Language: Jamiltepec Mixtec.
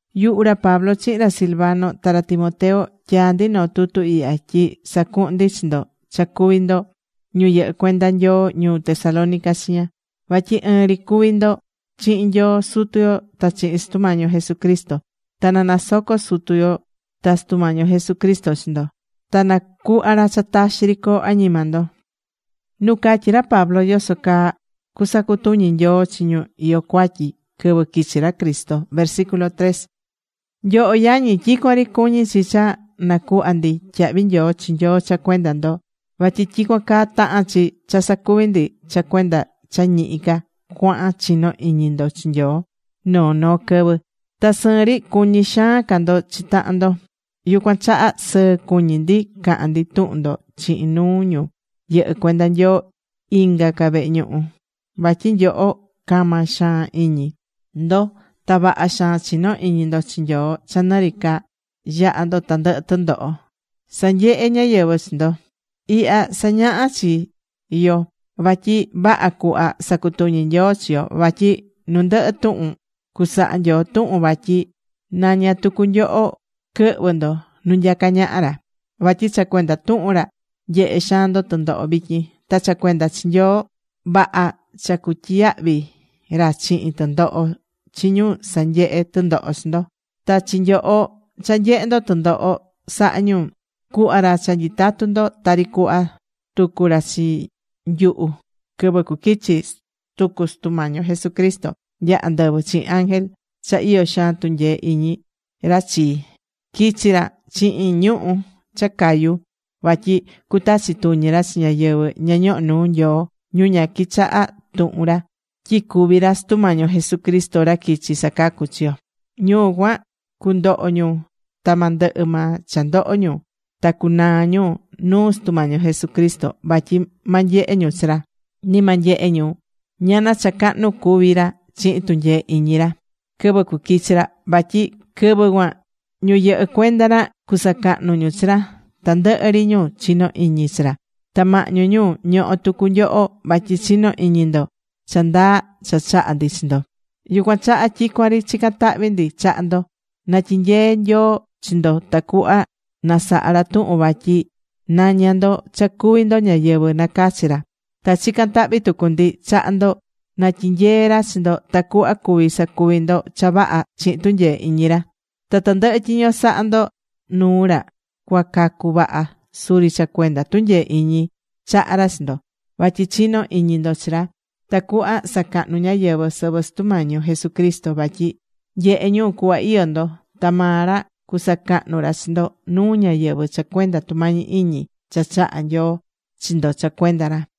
Yuhu ra Pablo chihin ra Silvano ta ra Timoteo, tyaá ndi noo tutu ihya tyi sacuhun ndi chi ndo cha cuví ndo ñu yɨhɨ́ cuenda Nyoo ñuu Tesalónica chiña. Vatyi ɨɨn ri cuví ndo chihin Nyoo Sutu yo ta chihin Sutu Mañi yo Jesucristo. Ta na nasoco Nyoo Sutu yo ta Sutu Mañi yo Jesucristo chi ndo. Ta na cuhva ra cha taxi ri coo añima ndo.Nu catyi̱ ra Pablo yoso caa cusacutuñi Nyoo chi ñu iyó cuatyi quɨvɨ quichi ra Cristo Nyoho yañi, tyicuan ri cuñí chi cha nacuhva ndi tyahvi nyoo chi Nyoo cha cuenda ndo, vatyi tyicuan caa tahán chi cha sacuví ndi cha cuenda cha ñihi ca cuahan chinó iñi ndo chi Nyoo noo noo quɨvɨ, ta sɨɨn ri cuñí xaan ca ndo chi tahan ndo. Yucuan chaha sɨɨ cuñí ndi cahán ndi tuhun ndo chihin nuu ñu yɨhɨ́ cuenda Nyoo inga ca vehe ñuhu. Vatyi nyoho cama xaan iñi ndo ta vaha xaan chinó iñi ndo chi Nyoo cha nɨ ri ca yahá ndo tandɨhɨ tɨndoho sanyehé ñáyɨvɨ chi ndo. Ihya sañahá chi yo vatyi vaha cuhva sacutuñi Nyoo chi yo, vatyi nu ndɨhɨ tuhun cusaha Nyoo tuhun vatyi naña tucu nyoho quɨhvɨ ndo nu nyacá ñaha ra. Vatyi cha cuenda tuhun ra, nyehe xaan ndo tɨndoho vityin. Ta cha cuenda chi Nyoo, vaha cha cutyiyahvi ra chihin tɨndoho chi ñu sanyehé tɨndoho chi ndo. Ta chi nyoho cha nyehé ndo tɨndoho sahá ñu, cuhva ra cha nyitatu ndo tari cuhva tucu ra chi nyuhu, quɨvɨ cuquichi tucu Sutu Mañi yo Jesucristo nya andɨvɨ chihin ángel cha iyó xaan tunyee iñi ra chi, quichi ra chihin ñuhu̱ cha cayú. Vatyi cutachi tuñi ra chi ñáyɨvɨ ña ñohó nuu Nyoo, ñu ña quichahá tuhun ra, tyi cuví ra Sutu Mañi yo Jesucristo, ra quichi̱ sacacu chi yo. Ñu cuan, cundoho ñu ta ma ndɨhɨ maa cha ndoho ñu, ta cunaa ñu nuu Sutu Mañi yo Jesucristo vatyi ma nyehe ñu chi ra. Ni ma nyehe ñu ñana cha cahnu cuví ra chihin tunyee iñi ra quɨvɨ cuquichi ra. Vatyi quɨvɨ cuan ñu yɨhɨ́ cuenda ra cusacahnu ñu chi ra, tandɨhɨ ri ñu chinó iñi chi ra. Ta mahñu ñu, ñohó tucu nyoho vatyi chinó iñi ndo cha ndaa cha chaha̱ ndi chi ndo. Yucuan chaha tyicuan ri chicán tahvi ndi chaha ndo, na tyinyee Nyoo yo chi ndo tacuhva na saha ra tuhun vatyi naña ndo cha cuví ndo ñáyɨvɨ nacachi̱ ra. Ta chicán tahvi tucu ndi chaha ndo na tyinyee ra chi ndo tacuhva cuvi sacuvi ndo cha vaha chihin tunyee iñi ra. Ta tandɨhɨ tyiño sahá ndo nuu ra cuacacu vaha, suri cha cuenda tunyee iñi chahá ra chi ndo vatyi chinó iñi ndo chi ra. Tacuhva sacahnu ñáyɨvɨ sɨvɨ Sutu Mañi yo Jesucristo, vatyi nyehé ñu cuhva iyó ndo. Ta maa ra cusacahnu ra chi ndo nuu ñáyɨvɨ cha cuenda tumañi iñi cha chahá Nyoo chi ndo cha cuenda ra.